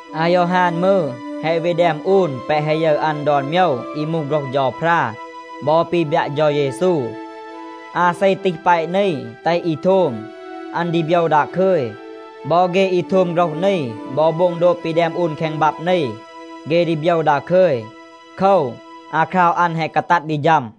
อายอฮาน มืร, แฮะ วี แดม อูน แปะ แฮะ ยึร อัน ดอน โมยว อี มูห โฆรห เฌาพรา บอ ปี บยัะ เฌา เยซู. อาเซ ตีห แปะ นี แตห อี โทม, อัน ดี โบยว ดาคึย. บอ เฆ อี โทม โฆรห นี บอ โบง โดบ ปี แดม อูน แคง บับ นี, เฆ ดี โบยว ดาคึย. โคว, อาคราว อัน แฮะ กาตัด ดี ฌัม.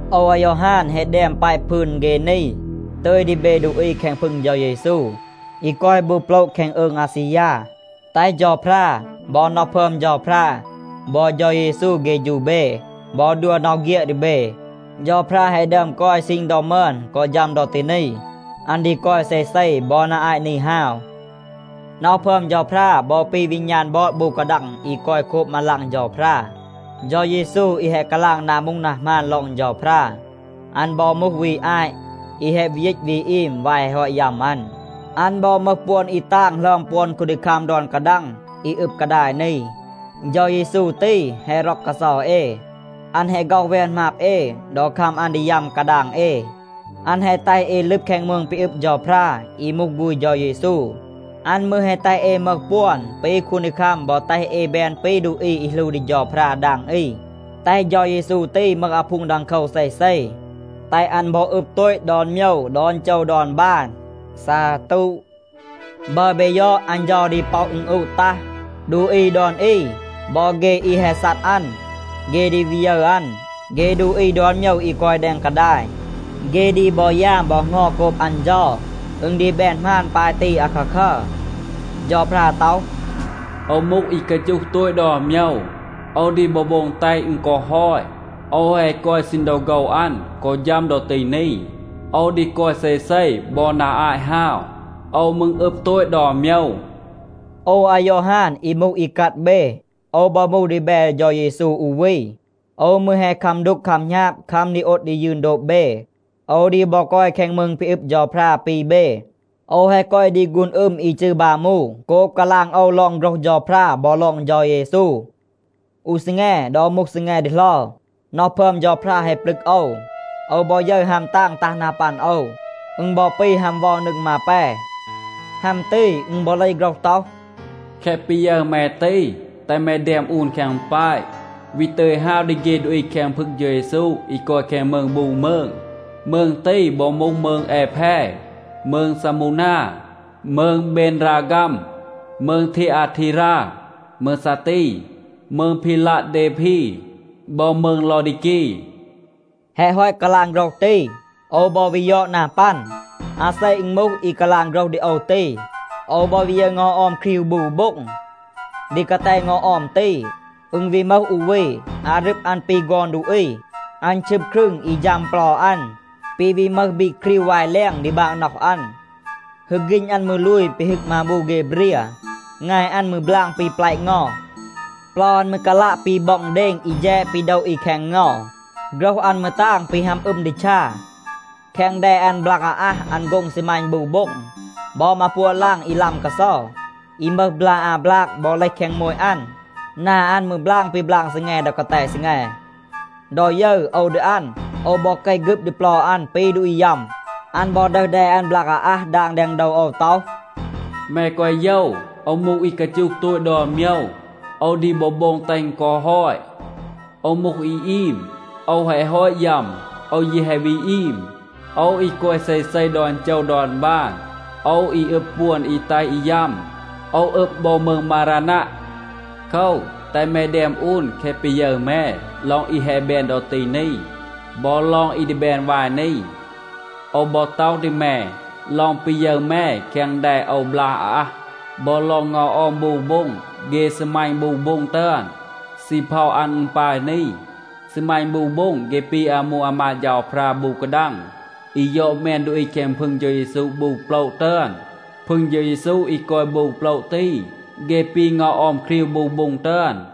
โอว อายอฮาน แฮะ แดม แปะ พืน เฆ นี ตึย ดี เบ ดูอี แคง พึง เฌา เยซู อี กอย บู โปละ แคง อืง อาซียา. แตห เฌาพรา บอ น็อห พึอม เฌาพรา บอ เฌา เยซู เฆฌู เบ บอ ดัว น็อห เฆียด ดี เบ. เฌาพรา แฮะ ดึอม กอย ซีณ ดอ มึอน กอ ฌัม ดอ ตี นี. อัน ดี กอย เซเซ บอ นา อาต นี ฮาว. น็อห พึอม เฌาพรา บอ ปี วีณาน บอด บู กาดัง อี กอย โคบ มาลาง เฌาพรา. เฌา เยซู อี แฮะ กาลาง นา มูห นา หมาน ลอง เฌาพรา, อัน บอ มูห วี อาต, อี แฮะ วี ยีต วี อีม วาย แฮะ ฮอต ยัม อัน. อัน บอ มึห ปวน อี ตาง หลึอม ปวน คูนดีคัม ดอน กาดัง อี อึบ กาดาย นี. เฌา เยซู ตี แฮะ ร็อก กาเซา เอ. อัน แฮะ ฆ็อห แวน หมาบ เอ ดอ คัม อัน ดี ยัม กาดาง เอ. อัน แฮะ แตห เอ ลึบ แคง มืง ปี อึบ เฌาพรา อี มูห ฆูณ เฌา เยซู. อัน มืร แฮะ แตห เอ มึห ปวน ปี คูนดีคัม บอ แตห เอ แบน ปี ดูอี อี หลู ดี เฌาพรา ดาง อี, แตห เฌา เยซู ตี มึห อาพูง ดังโคว เซเซ. แตห อัน บอ อึบ โตต ดอน โมยว ดอน โจว ดอน บาน. ซาตู. บัร เบ ยอด, อัน เฌา ดี ป็อะ อึณอูะ ตัห. ดูอี ดอน อี บอ เฆ อี แฮะ ซัด อัน, เฆ ดี วี ยึร อัน. เฆ ดูอี ดอน โมยว อี กอย แดง กาดาย, เฆ ดี บอ ยาม บอ เหงา โกบ อัน เฌา. อึณ ดี แบน หมาน ปาย ตี อาคาคัร. เฌาพรา ต็อห, “โอว มูห อี กาจูห โตต ดอน โมยว. โอว ดี บอ โบง แตห อึณ กอ ฮอต.a โอว แฮะ กอย ซีณ ดอ โฆว อัน กอ ฌัม ดอ ตี นี. โอว ดี กอย เซเซ บอ นา อาต ฮาว. โอว มืร อึบ โตต ดอน โมยว.” โอว อายอฮาน อี มูห อีกัด เบ, โอว บอ มูห ดีแบ เฌา เยซู อู วี. โอว มืร แฮะ คัม ดูก คัม หณาบ, คัม ดี โอด ดี ยืน โดบ เบ. โอว ดี บอ กอย แคง มืง ปี อึบ เฌาพรา ปี เบ. โอว แฮะ กอย ดี ฆูน อึม อี จืร บามู โกบ กาลาง โอว ลอง โฆรห เฌาพรา บอ ลอง เฌา เยซู. อู ซีแง ดอ มูห ซีแง ดีเหลา, น็อห พึอม เฌาพรา แฮะ ปลึก โอว. โอว บอ ยึร ฮัม ตาง ตัห นา ปัน โอว. อึณ บอ ปี ฮัม เวา นึง มาแป. ฮัม ตี อึณ บอ เลห โฆรห ต็อห, “แคะ ปี ยึร แม ตี, แตห แม แดม อูน แคง แปะ, วี ตึย ฮาว ดี เฆ ดูอี แคง พึง เฌา เยซู อี กอย แคง มืง บู มืง. มืง ตี บอ มูห มืง แอแพ, มืง ซามูนา, มืง เบนราฆัม, มืง ทีอาทีรา, มืง ซาตี, มืง พีลัะเดพี, บอ มืง ลอดีกี.” แฮะ ฮอต กาลาง โฆรห ตี, โอว บอ วี ยอด นา ปัน, อาเซ อึณ มูห, อี กาลาง โฆรห ดี โอว ตี. โอว บอ วี ยึร เงา ออม ครีว บู โบ็ง. ดี กาแต เงา ออม ตี, อึณ วี มึห อู วี. อารึบ อัน ปี ฆอน ดูอี. อัน ชึบ ครึง อี ฌัม เปลา อัน, ปี วี มึห บีก ครีว วาย แลง ดี บางน็อห อัน. ฮึก ฆีณ อัน มืร ลูย ปี ฮึก มาบู เฆ เบรีย. งาย อัน มืร บลาง ปี แปละ เงา. เปลา อัน มืร กาลัะ ปี บ็อง เดณ อี แฌด ปี โดะ อี แคง เงา. โฆรห อัน มืร ตาง ปี ฮัม อึม ดีชา. แคง แด อัน บลาก อาอัห, อัน โฆ็ง ซีมัณ บู โบ็ง. บอ มาปัวะ ลาง อี ลัม กาเซา, อี มึห บลา อา บลาก บอ เลห แคง โมต อัน. นา อัน มืร บลาง ปี บลาง ซีแง ดอ กาแต ซีแง. ดอ ยึร โอว ดี อัน, โอว บอ เกห ฆึบ ดี เปลา อัน ปี ดูอี ยัม. อัน บอ ดึห แด อัน บลาก อาอัห ดาง แดง โดว โอว ต็อห, “แม แกวะ โยว, โอว มูห อี กาจูห โตต ดอน โมยว, โอว ดี บอ โบง แตห อึณ กอ ฮอต. โอว มูห อี อีม. โอว แฮะ ฮอต ยัม, โอว ยี แฮะ วี อีม. โอว อี กอย เซเซ ดอน โจว ดอน บาน. โอว อี อึบ ปวน อี แตห อี ยัม. โอว อึบ บอ มืง มารานัะ. โคว, แตห แม แดม อูน แคะ ปี ยึร แม ลอง อี แฮะ แบน ดอ ตี นี, บอ ลอง อี ดี แบน วาย นี. โอว บอ ต็อห ดี แม ลอง ปี ยึร แม แคง แด โอว บลาก อาอัห, บอ ลอง เงา ออม บู โบ็ง เฆ ซีมัณ บู โบ็ง ตึอน. ซีเพา อัน อึณ ปาย นี. ซีมัณ บู โบ็ง เฆ ปี อามู อามาด เฌาพรา บู กาดัง อี ยอด แมน ดูอี แคง พึง เฌา เยซู บู โปละ ตึอน. พึง เฌา เยซู อี กอย บู โปละ ตี, เฆ ปี เงา ออม ครีว บู โบ็ง ตึอน.”